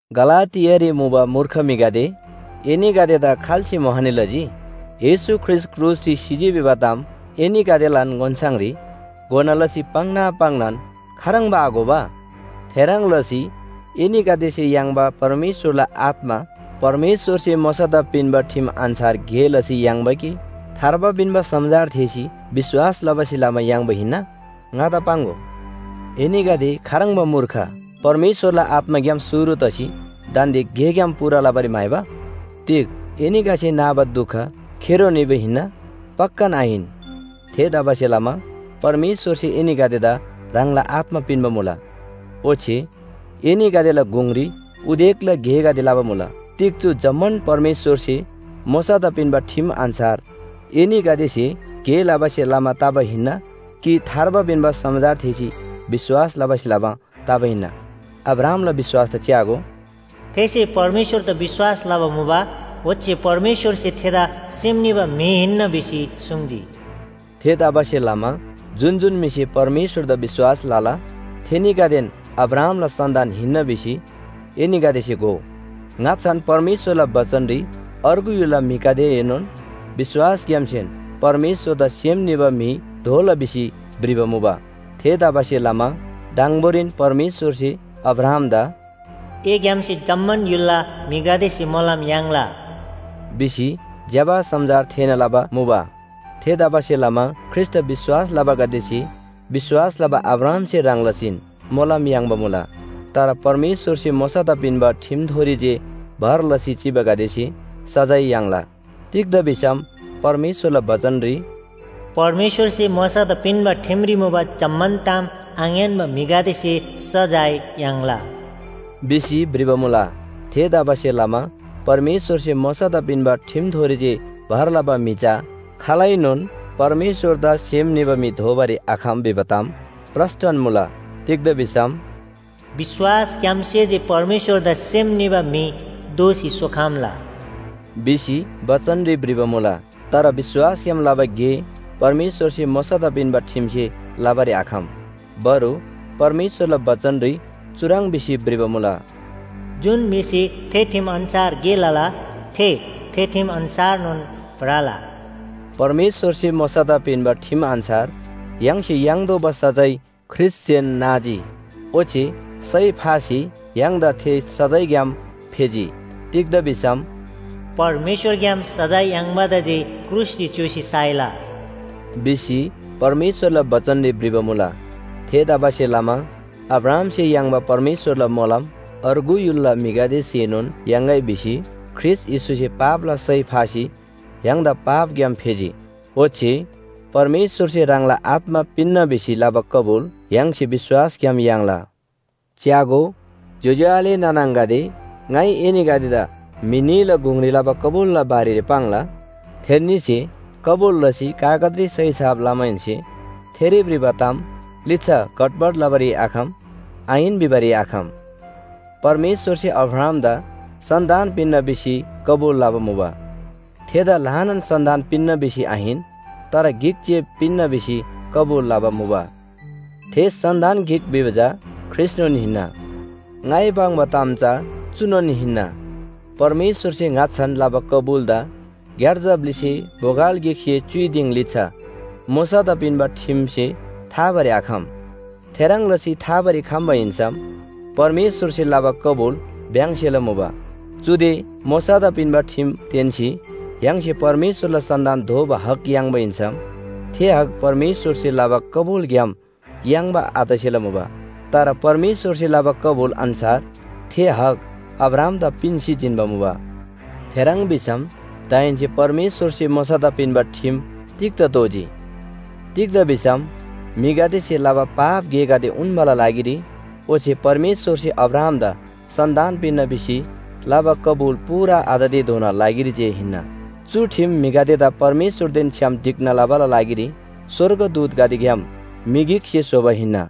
गलातियारी मुबा मूर्ख म्‍हिगदे, एनीगदेदा खाल्‍से मोहनी लजी? येशू ख्रीष्‍ट क्रुसरी सिजी भिबा ताम एनीगदेलान ओन्‍छाङरी घोना लसी पाङ्ना पाङ्नान खाह्रङ्बा आघोबा? थेह्रङ् लसी एनीगदेसे याङ्बा परमेश्‍वरला आत्‍मा परमेश्‍वरसे मोशादा पिन्‍बा ठिम अन्‍छार गे लसी याङ्बा कि थार्बा पिन्‍बा समाचार थेःसी विश्‍वास लबासे लमा याङ्बा हिन्‍ना? ङादा पाङ्‍गो। एनीगदे खाह्रङ्बा मूर्ख, परमेश्‍वरला आत्‍माग्‍याम शुरु तसी दान्‍दे गेग्‍याम पूरा तबारी म्‍हाइबा? तिग एनीगदेसे नाबा दुख खेरो निबा हिन्‍ना? पक्‍कान आहिन। थेतबासेलमा परमेश्‍वरसे एनीगदेदा ह्राङला आत्‍मा पिन्‍बा मुला, ओच्‍छे एनीगदेला गुङरी उदेकला गेगदे लबा मुला। तिग चु जम्‍मान परमेश्‍वरसे मोशादा पिन्‍बा ठिम अन्‍छार एनीगदेसे गे लबासे लमा तबा हिन्‍ना, कि थार्बा पिन्‍बा समाचार थेःसी विश्‍वास लबासे लमा तबा हिन्‍ना? अब्राहामला विश्‍वासदा च्‍यागो, “थेसे परमेश्‍वरदा विश्‍वास लबा मुबा। ओच्‍छे परमेश्‍वरसे थेदा सेम निबा म्‍हि हिन्‍ना भिसी सुङ्जी।” थेतबासेलमा जुन जुन म्‍हिसे परमेश्‍वरदा विश्‍वास लला, थेनीगदेन अब्राहामला सन्‍तान हिन्‍ना भिसी एनीगदेसे घोउ। ङाच्‍छान परमेश्‍वरला बचनरी अर्गु य्‍हुलला म्‍हिगदेएनोन विश्‍वासग्‍यामसेन परमेश्‍वरदा सेम निबा म्‍हि दोला भिसी भ्रिबा मुबा। थेतबासेलमा दङबोरीन परमेश्‍वरसे अब्राहामदा “एग्‍यामसे जम्‍मान य्‍हुलला म्‍हिगदेसे मोलम याङ्ला” भिसी ज्‍यबा समाचार थेःना लबा मुबा। थेतबासेलमा ख्रीष्‍टदा विश्‍वास लबागदेसे विश्‍वास लबा अब्राहामसे ह्रङ् लसीन मोलम याङ्बा मुला। तर परमेश्‍वरसे मोशादा पिन्‍बा ठिमथोरी जे भर लसी चिबागदेसे सजाय याङ्ला। तिग्‍दा भिसम परमेश्‍वरला बचनरी “परमेश्‍वरसे मोशादा पिन्‍बा ठिमरी मुबा जम्‍मान ताम आङ्‌यान्‍बा म्‍हिगदेसे सजाय याङ्ला” भिसी भ्रिबा मुला। थेतबासेलमा परमेश्‍वरसे मोशादा पिन्‍बा ठिमथोरी जे भर लबा म्‍हि चा खालैनोन परमेश्‍वरदा सेम निबा म्‍हि दोबारी आखम भिबा ताम प्रस्‍टन मुला। तिग्‍दा भिसम “विश्‍वासग्‍यामसे जे परमेश्‍वरदा सेम निबा म्‍हि दोसी सोखम्‍ला” भिसी बचनरी भ्रिबा मुला। तर विश्‍वासग्‍याम लबा गे परमेश्‍वरसे मोशादा पिन्‍बा ठिमसे लबारी आखम। बरु परमेश्‍वरला बचनरी चुह्रङ् भिसी भ्रिबा मुला, “जुन म्‍हिसे थे ठिम अन्‍छार गे लला, थे, थे ठिम अन्‍छारनोन भ्रला।” परमेश्‍वरसे मोशादा पिन्‍बा ठिम अन्‍छार य्‍हाङसे याङ्तोःबा सजाय ख्रीष्‍टसेन नाजी, ओच्‍छे सय फासी य्‍हाङदा थे सजायग्‍याम फेजी। तिग्‍दा भिसम “परमेश्‍वरग्‍याम सजाय याङ्बादा जे क्रुसरी च्‍योसी साइला” भिसी परमेश्‍वरला बचनरी भ्रिबा मुला। थेतबासेलमा अब्राहामसे याङ्बा परमेश्‍वरला मोलम अर्गु य्‍हुलला म्‍हिगदेसेनोन याङ्‌गै भिसी ख्रीष्‍ट येशूसे पापला सय फासी य्‍हाङदा पापग्‍याम फेजी। ओच्‍छे परमेश्‍वरसे ह्राङला आत्‍मा पिन्‍ना भिसी लबा कबुल य्‍हाङसे विश्‍वासग्‍याम याङ्ला। च्‍यागो ज्‍योज्‍यो आले नाना आङागदे, ङाइ एनीगदेदा म्‍हि न्‍हीला गुङरी लबा कबुलला बारेरी पाङ्ला, थेन्‍नीसे कबुल लसी कागजरी सही छाप लमाहेन्‍से थेरी भ्रिबा ताम लिच्‍छा घटबट लबारी आखम, आहिन भिबारी आखम। परमेश्‍वरसे अब्राहामदा सन्‍तान पिन्‍ना भिसी कबुल लबा मुबा। थेदा ल्‍हानान सन्‍तान पिन्‍ना भिसी आहिन, तर गिक जे पिन्‍ना भिसी कबुल लबा मुबा। थे सन्‍तान गिक भिबा चा ख्रीष्‍टनोन हिन्‍ना। ङाइ पाङ्बा ताम चा चुनोन हिन्‍ना, परमेश्‍वरसे ङाच्‍छान लबा कबुलदा ग्‍यार्जा ब्‍लिसे बोगल गिकसे च्‍युइ दिङ लिच्‍छा मोशादा पिन्‍बा ठिमसे थाबारी आखम, थेह्रङ् लसी थाबारी खम्‍बा हिन्‍सम परमेश्‍वरसे लबा कबुल भ्‍याङ्सेला मुबा। चुदे मोशादा पिन्‍बा ठिम तेन्‍सी य्‍हाङसे परमेश्‍वरला सन्‍तान दोबा हक याङ्बा हिन्‍सम, थे हक परमेश्‍वरसे लबा कबुलग्‍याम याङ्बा आतसेला मुबा। तर परमेश्‍वरसे लबा कबुल अन्‍छार थे हक अब्राहामदा पिन्‍सी जिन्‍बा मुबा। थेह्रङ् भिसम दाहेन्‍से परमेश्‍वरसे मोशादा पिन्‍बा ठिम तिग्‍दा तोःजी? तिग्‍दा भिसम म्‍हिगदेसे लबा पाप गेगदे उन्‍बाला लागिरी ओच्‍छे परमेश्‍वरसे अब्राहामदा सन्‍तान पिन्‍ना भिसी लबा कबुल पूरा आततेधोनाला लागिरी जे हिन्‍ना। चु ठिम म्‍हिगदेदा परमेश्‍वरदेन छ्‌याम ढिक्‍ना लबाला लागिरी स्‍वर्गदूतगदेग्‍याम म्‍हि गिकसे स्‍होबा हिन्‍ना।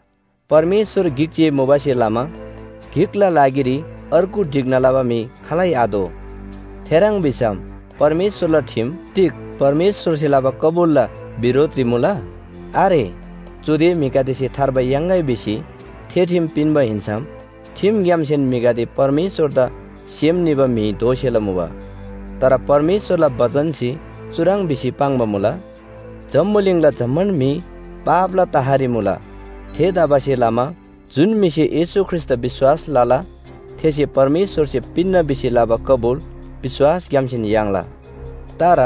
परमेश्‍वर गिक जे मुबासे लमा गिकला लागिरी अर्गु ढिक्‍ना लबा म्‍हि खालै आतोः। थेह्रङ् भिसम परमेश्‍वरला ठिम तिग परमेश्‍वरसे लबा कबुलला बिरोधरी मुला? आरे। चुदे म्‍हिगदेसे थार्बा याङ्‌गै भिसी थे ठिम पिन्‍बा हिन्‍सम ठिमग्‍यामसेन म्‍हिगदे परमेश्‍वरदा सेम निबा म्‍हि दोसेला मुबा। तर परमेश्‍वरला बचनसे चुह्रङ् भिसी पाङ्बा मुला, जम्‍बुलिङला जम्‍मान म्‍हि पापला तहरी मुला। थेतबासेलमा जुन म्‍हिसे येशू ख्रीष्‍टदा विश्‍वास लला, थेसे परमेश्‍वरसे पिन्‍ना भिसी लबा कबुल विश्‍वासग्‍यामसेन याङ्ला। तर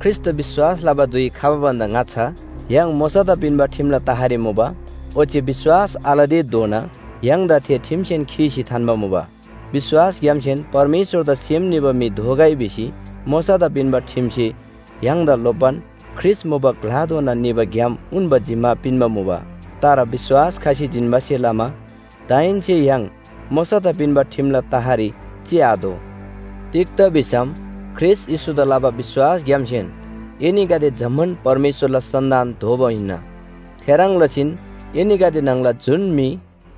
ख्रीष्‍टदा विश्‍वास लबा धुइ खबा भन्‍दा ङाच्‍छा य्‍हाङ मोशादा पिन्‍बा ठिमला तहरी मुबा, ओच्‍छे विश्‍वास आलतेधोना य्‍हाङदा थे ठिमसेन खीसी थान्‍बा मुबा। विश्‍वासग्‍यामसेन परमेश्‍वरदा सेम निबा म्‍हि दोगै भिसी मोशादा पिन्‍बा ठिमसे य्‍हाङदा लोप्‍बान ख्रीष्‍ट मुबा ग्‍लाधोना निबा ग्‍याम उन्‍बा जिम्‍मा पिन्‍बा मुबा। तर विश्‍वास खसी जिन्‍बासे लमा दाहेन्‍से य्‍हाङ मोशादा पिन्‍बा ठिमला तहरी चिआतोः। तिग्‍दा भिसम ख्रीष्‍ट येशूदा लबा विश्‍वासग्‍यामसेन एनीगदे जम्‍मान परमेश्‍वरला सन्‍तान दोबा हिन्‍ना। थेह्रङ् लसीन एनीगदे न्‍हङला जुन म्‍हि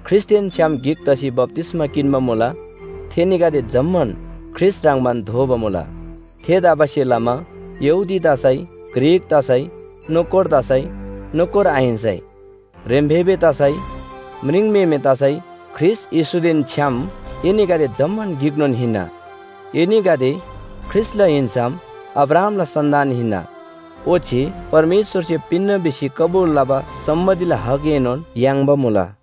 ख्रीष्‍टदेन छ्‌याम गिक तसी बप्‍तिस्‍मा किन्‍बा मुला, थेनीगदे जम्‍मान ख्रीष्‍ट ह्रङ्‌बान दोबा मुला। थेतबासेलमा यहूदी तसै, ग्रीक तसै, नोकर तसै, नोकर आहिन्‍सै, ह्रेम्‍फेबे तसै, म्रिङम्‍हेमे तसै ख्रीष्‍ट येशूदेन छ्‌याम एनीगदे जम्‍मान गिकनोन हिन्‍ना। एनीगदे ख्रीष्‍टला हिन्‍सम अब्राहामला सन्‍तान हिन्‍ना, ओच्‍छे परमेश्‍वरसे पिन्‍ना भिसी कबुल लबा सम्‍पत्तिला हकएनोन याङ्बा मुला।